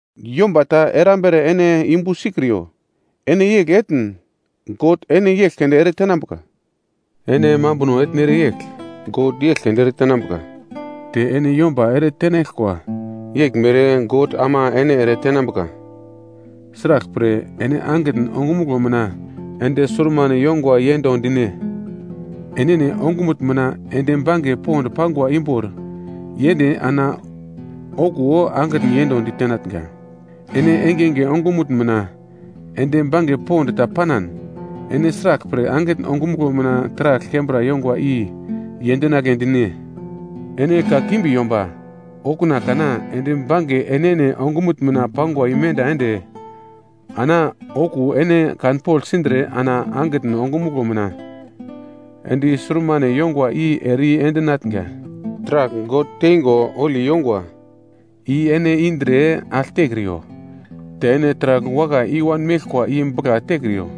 “Yomba ta erambere ene yumbu sikriyo, ene yegl etn, God ene yegl keunde eretenambuka. Ene mambuno etnere yegl, God yegl keunde eretenambuka, te ene yomba ere tenaglkwa yeglmere God ama ene ere tenambuka. “Sraglpre ene angitn ongumuglo mina endi surmane yongwa yendo dine? Enene ongumutn mina endi bange pond pangwa imbor yende ana okuwo angitn yendo ditenatnga. Ene engenge ongumutn mina ende bange pond ta panan, ene sraglpre angitn ongumuglo mina taragl kembra yongwa, i yendinagle dine? Ene kakimbi yomba, okuna kana endi bange enene ongumutn mina pangwa imenda ende ana okuwo ene kanpogl sindre ana angitn ongumuglo mina endi surmane yongwa i ere i-endinatnga. “Taragl God teingo holi yongwa i ene indre agl tekriyo, te ene taragl wakai i-wan meglkwa i bugla tekriyo.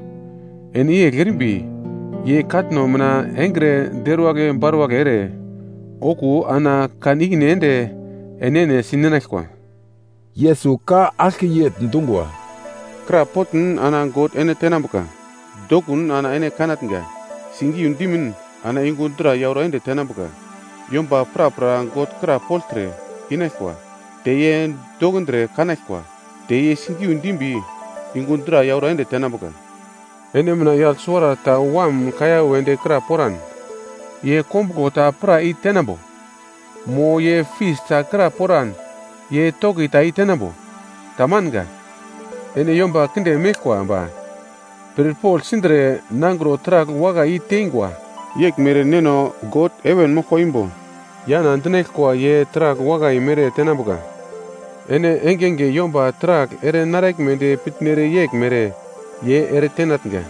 Ene yegl erimbi, ye katno mina engre deruwagl baruwagl ere, okuwo ana kan ikine ende enene si ninaglkwa.” Yesus ka aglke yegl dungwa, “Krapotn ana God ene tenambuka, dokun ana ene kanatnga. Sigiu dimin ana yungu dra yauro ende tenambuka. Yomba prapra God krapogltre, inaglkwa; te ye dokindre kanaglkwa. Te ye sigiu dimbi, yungu dra yauro ende tenambuka. “Ene mina yagl suwarata wam kaiya wedi kra poran, ye kombuglo ta pra i-tenambo? Mo ye fis ta kra poran ye toki ta i-tenambo? Tamanga. Ene yomba kinde meglkwa ba, pirpogl sindre nangro taragl wakai i-teingwa, yeglmere Neno God heven moglkwa imbo, yana dinaglkwa ye taragl wakai mere tenambuka. Ene engenge yomba taragl ere naraglmedi pitnere yeglmere ye eretenatnga,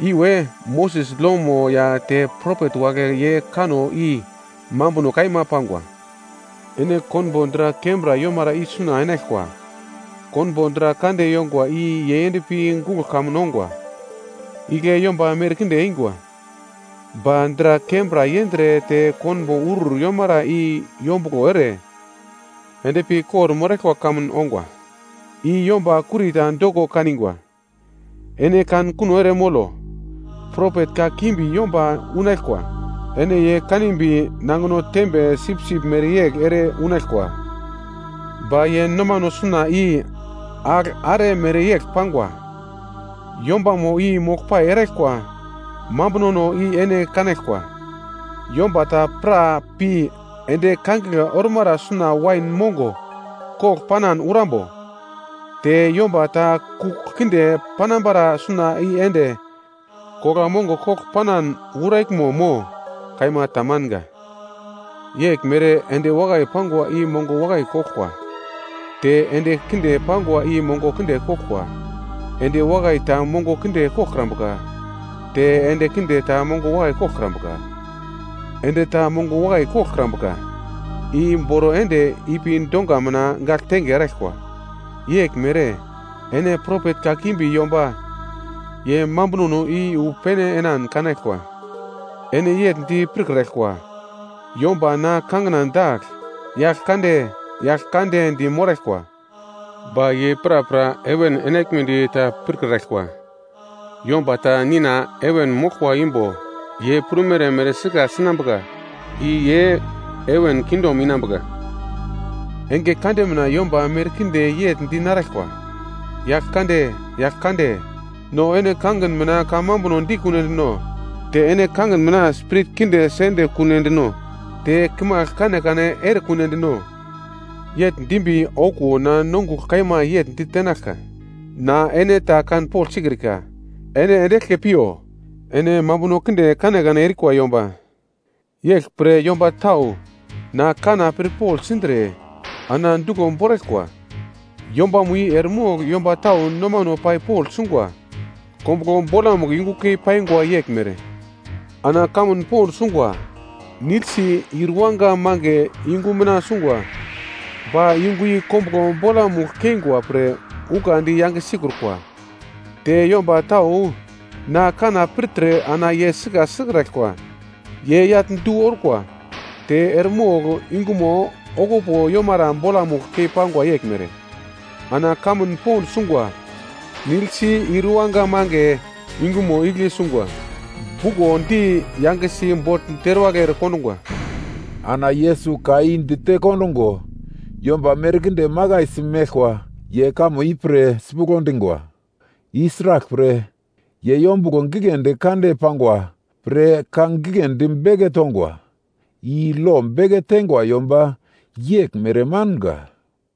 i we Moses lomo ya te propet wagle ye kanno i mambuno kaima pangwa. “Ene konbo dra kembra yomara i suna enaglkwa. Konbo dra kande yongwa i yei endpi guglo kamun ongwa, igle yomba merkinde eingwa. Ba dra kembra yendre te konbo urur yomara i yombuglo ere, endpi kor-moraglkwa kamun ongwa, i yomba kurita doko kan ingwa. “Ene kan kuno ere molo, propet kakimbi yomba unaglkwa. Ene ye kanimbi nangino tembe sipsip mereyegl ere unaglkwa, ba ye nomano suna i agl are mereyegl pangwa. Yombamo i moglpai eraglkwa mambunono i ene kanaglkwa. Yomba ta pra pi endi kangigle ormara suna wain mongo kogl panan urambo? Te yomba ta kugl kinde panambara suna i ende kogla mongo kogl panan uraglmo mo? Kaima tamanga. Yeglmere endi wakai pangwa i mongo wakai koglkwa, te endi kinde pangwa i mongo kinde koglkwa. Endi wakai ta mongo kinde koglkrambuka, te endi kinde ta mongo wakai koglkrambuka. Endi ta mongo wakai koglkrambuka, i boro ende ipi donga mina gagltenge eraglkwa. Yeglmere ene propet kakimbi yomba ye mambunono i wu pene enan kanaglkwa. “Ene yegl di pirkraglkwa, yomba na kangina dagl, Yaglkande, Yaglkande di moraglkwa, ba ye prapra heven enaglmedi ta pirkraglkwa, yomba ta Nina heven moglkwa imbo ye prumere mere sika sinambuka i ye heven kingdom enambuka. Enge kande mina yomba merkinde yegl di naraglkwa, ‘Yaglkande, Yaglkande, no ene kangin mina kamambuno dikunedino? Te ene kangin mina spirit kinde sende kuno endino? Te kimagl kanekane erekunedino?’ Yegl dimbi okuwo na nongugl kaima yegl ditenaglka, ‘Na ene ta kanpogl sikrika. Ene ende eglke piyo, ene mambuno kinde kanekane erikwa yomba. “Yeglpre yomba tau na kanna pirpogl sindre ana duglo boraglkwa, yombamo i eremogl yomba tau nomano pai pogl sungwa kombuglo bolamugl yungu kei paingwa yeglmere. Ana kamun pond sungwa, nigl si, ir iwanga mange yungu mina sungwa. Ba yungu i kombuglo bolamugl keingwa pre ukandi yange sikrukwa. Te yomba tau na kanna i pirtre ana ye sika sikraglkwa, ye yagl du orkwa ta eremogl yungumo okupo yomara bolamugl keingwa yeglmere. Ana kamun pond sungwa, nigl si, ir yuwanga mange yungumo igle sungwa, bukondi yangesi bogl deruwagl ere kondungwa.” Ana Yesus ka i dite kondungo, yomba merkinde makaisi meglkwa ye kamo i pir sipuglo dingwa. I sraglpre, ye yombuglo gigledi kande pangwa pre ka giglendi beke tongwa, i lo beke teingwa yomba yeglmere manga.